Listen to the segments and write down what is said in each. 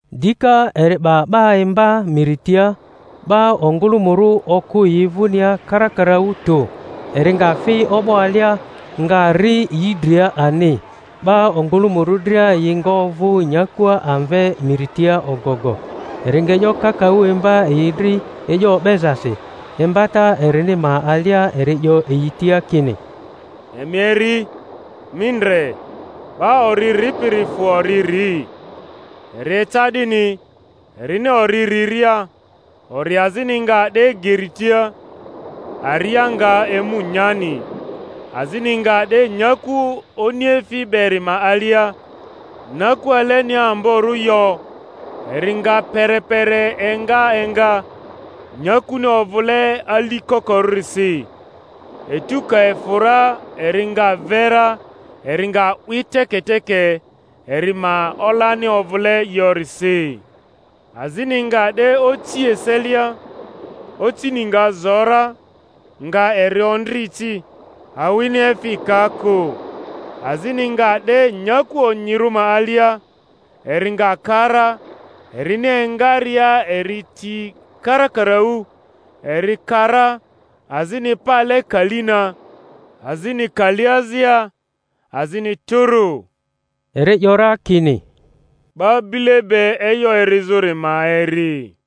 Dika eri 'ba 'ba imba miri tia. 'Ba ongᴜlᴜmᴜrᴜ okᴜ yi vᴜnia karakaraᴜ tᴜ; eri nga fi o'bo alia, nga ri yi dria ani; 'ba ongᴜlᴜmᴜrᴜ dria yi nga ovᴜ nyakua amve miri tia ogogo. Eri nga e'yo kakaᴜ imba yi dri e'yo o'bezasi; imbata erini ma alia eri 'yo yi tia kini: Emi eri! Mi ndre, 'ba ori ripiri fᴜ ori ri. Eri eca 'dini, erini ori riria, ori azini nga 'de geri tia, aria nga emu nyani. Azini nga 'de nyaku oniefi beri ma alia, nyaku alenia amborᴜ yo; eri nga perepere enga enga, nyakuni ovᴜle ali kokorᴜrisi; etu ka efᴜ ra eri nga ve ra, eri nga 'wi teketeke eri ma olani ovᴜle yorisi. Azini nga 'de oci eselia, ocini nga zo ra, nga eri ondri ci, awini efi ka kᴜ. Azini nga 'de nyaku onyirᴜ ma alia, eri nga ka ra; erini engaria eri ti karakaraᴜ, eri ka ra, azini pale kali na, azini kali azia, azini tᴜrᴜ. Eri ‘yora, kini, 'Ba bile be e'yo erizᴜri ma eri.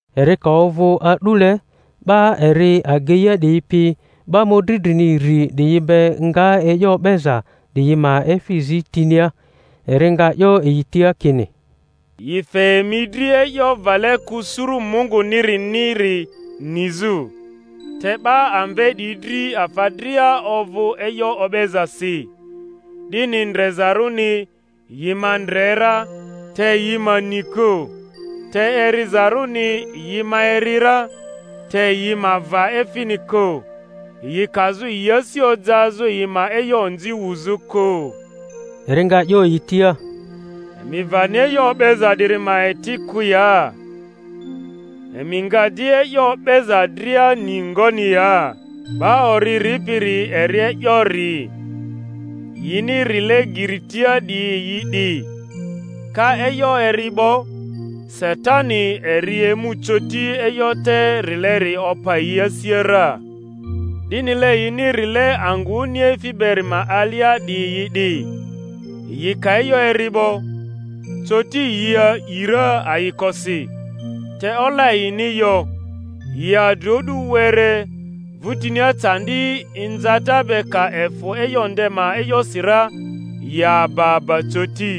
Eri ka ovᴜ a'dule, 'ba eri ageia 'diyi pi 'ba mᴜdri drini iri 'diyi be nga e'yo o'beza 'diyi ma efi zi tinia. Eri nga 'yo yi tia kini, Yi fe emi dri e'yo vale kᴜ suru Munguniriniri nizᴜ, te 'ba amve 'diyi dri afa dria ovᴜ e'yo o'bezasi; 'dini ndrezarᴜni, yi ma ndre ra, te yi ma ni kᴜ, te erizarᴜni, yi ma eri ra, te yi ma va efini kᴜ; yi kazᴜ yi asi ojazᴜ yi ma e'yo onzi wuzᴜ kᴜ. Eri nga 'yo yi tia, Emi vani e'yo o'beza 'diri ma eti kᴜ ya? Emi nga di e'yo o'beza dria ni ngoni ya? 'Ba ori ripiri eri e'yo ri. Yini rile geri tia 'diyi yi 'di: ka e'yo eri 'bo, Satani eri emu coti, e'yo te rileri opa yi asia ra. 'Dinile yini rile angᴜ oniefi beri ma alia 'diyi yi 'di: yi ka e'yo eri 'bo, coti yi a’i ra ayikosi; te ola yini yo, yi adri o'du were, vᴜtinia candi inzata be ka efᴜ e'yo nde ma e'yosi ra, yi aba aba coti.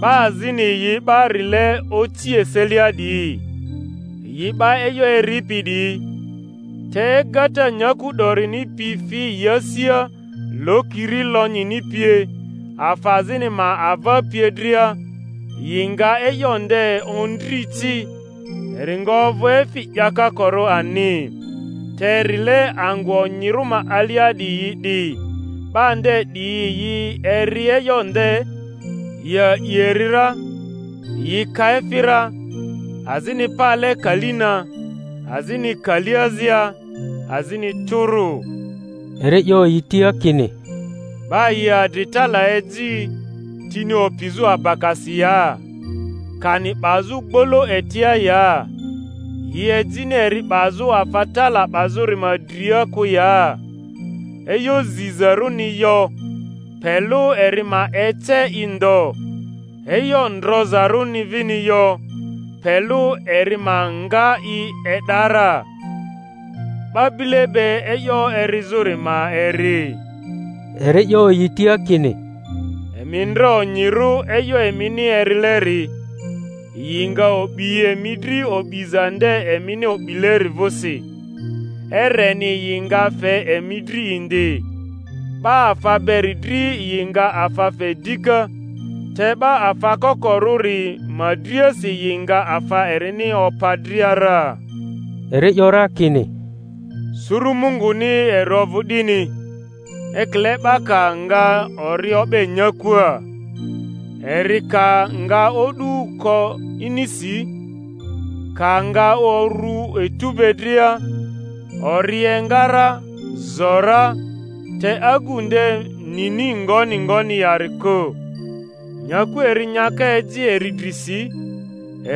'Ba azini yi 'ba rile oci eselia 'diyi, yi 'ba e'yo eripi 'diyi, te egata nyaku 'dorini pi fi yi asia, lokiri lonyini pie, afa azini ma ava pie dria, yi nga e'yo nde ondri ci, eri nga ovᴜ efi 'yakokorᴜ ani. Te rile angᴜ onyirᴜ ma alia 'diyi yi 'di: 'ba nde 'diyi yi eri e'yo nde, yi a'i eri ra, yi ka efi ra, azini pale kali na, azini kali azia, azini tᴜrᴜ. Eri 'yo yi tia kini, 'Ba yi adri tala eji, tini opizᴜ abakasi ya? kani 'bazᴜ gbolo etia ya? Yi ejini eri 'bazᴜ afa tala 'bazᴜri ma dria kᴜ ya? E'yo zizarᴜni yo, pe lᴜ eri ma ece i ndo; e'yo ndrozarᴜni vini yo, pe lᴜ eri ma nga i e'da ra. 'Ba bile be e'yo erizᴜri ma eri. Eri 'yo yi tia kini, Emi ndre onyirᴜ e'yo emini erileri; yi nga o'bi emi dri o'biza nde emini o'bileri vᴜsi, ereni yi nga fe emi dri indi. 'Ba afa beri dri yi nga afa fe dika; te 'ba afa kokorᴜri ma driasi yi nga afa erini opa dria ra. Eri 'yo ra kini, Surᴜ Munguni eri ovᴜ 'dini, ekile 'ba ka nga ori o'be nyakuaa; eri ka nga o'du ko inisi, ka nga orᴜ etu be dria; ori enga ra, zo ra, te agu nde nini ngoni ngoni yari kᴜ. Nyaku eri nyaka eji eri drisi;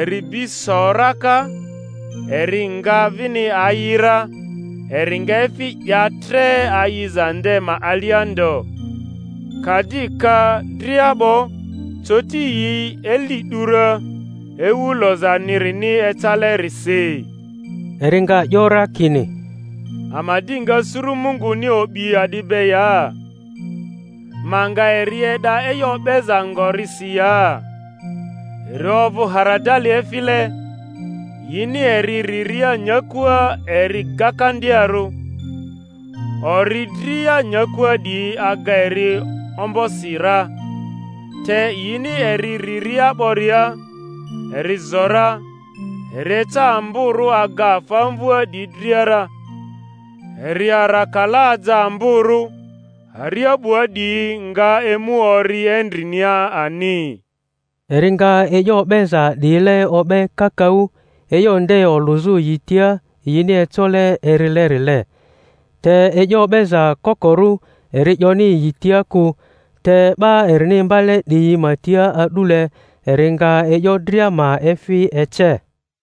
eri bi so raka, eri nga vini ayi ra, eri nga efi 'ya tre ayiza nde ma alia ndo; ka di ka dria 'bo, coti yi eli 'du ra, ewu lozanirini ecalerisi. Eri nga 'yo ra kini, Ama di nga suru Munguni o'bi a'di be ya? Ma nga eri e'da e'yo o'beza ngorisi ya? Eri ovᴜ haradali efile; yini eri riria nyakua eri gakandiarᴜ, ori dria nyakua 'diyi aga eri ombosi ra, te yini eri riria 'boria, eri zo ra, eri eca amborᴜ aga afa amvᴜa 'diyi dria ra, eri arakala aja amborᴜ, aria 'bua 'diyi nga emu ori endrinia ani. Eri nga e'yo o'beza 'diyile o'be kakaᴜ, e'yo nde olᴜzᴜ yi tia yini ecole erilerile; te e'yo o'beza kokorᴜ eri 'yoni yi tia kᴜ, te 'ba erini imbale 'diyi ma tia a'dule eri nga e'yo dria ma efi ece.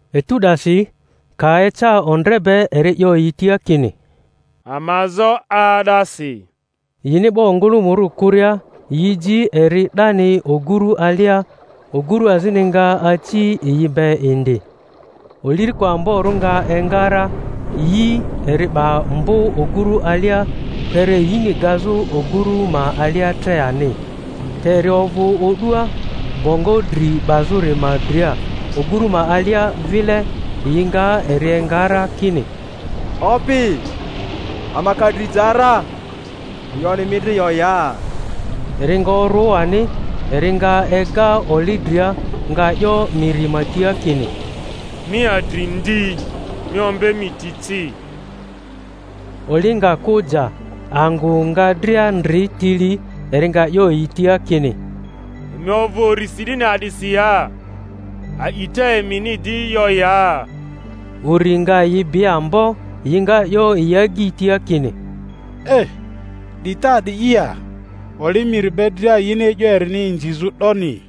Etu 'dasi, ka eca ondre be, eri 'yo yi tia kini, Ama zo 'aa'dasi. Yini 'ba ongᴜlᴜmᴜrᴜ kᴜria, yi ji eri 'dani oguru alia. Ogurᴜ azini nga aci yi be indi. Oliriko amborᴜ nga enga ra, yi eri 'ba mbᴜ oguru alia, kpere yini gazᴜ oguru ma alia tre ani. Te eri ovᴜ o'dua, bongo dri 'bazᴜri ma dria, oguru ma alia vile; yi nga eri enga ra, kini, Opi, ama ka dri ja ra, e'yoni mi dri yo ya? Eri nga orᴜ ani, eri nga ega oli dria, nga 'yo miri ma tia kini, Mi adri ndi! Mi ombe mi ti ci! Oli nga kᴜ ja, angᴜ nga dria ndri tili. Eri nga 'yo yi tia kini, Emi ovᴜ urisi 'dini a'disi ya? A'ita emini di yo ya? Uri nga yi bi ambo, yi nga 'yo yi agyi tia kini, 'Di te a’di ya, oli miri be dria yini e'yo erini inzizᴜ ‘doni?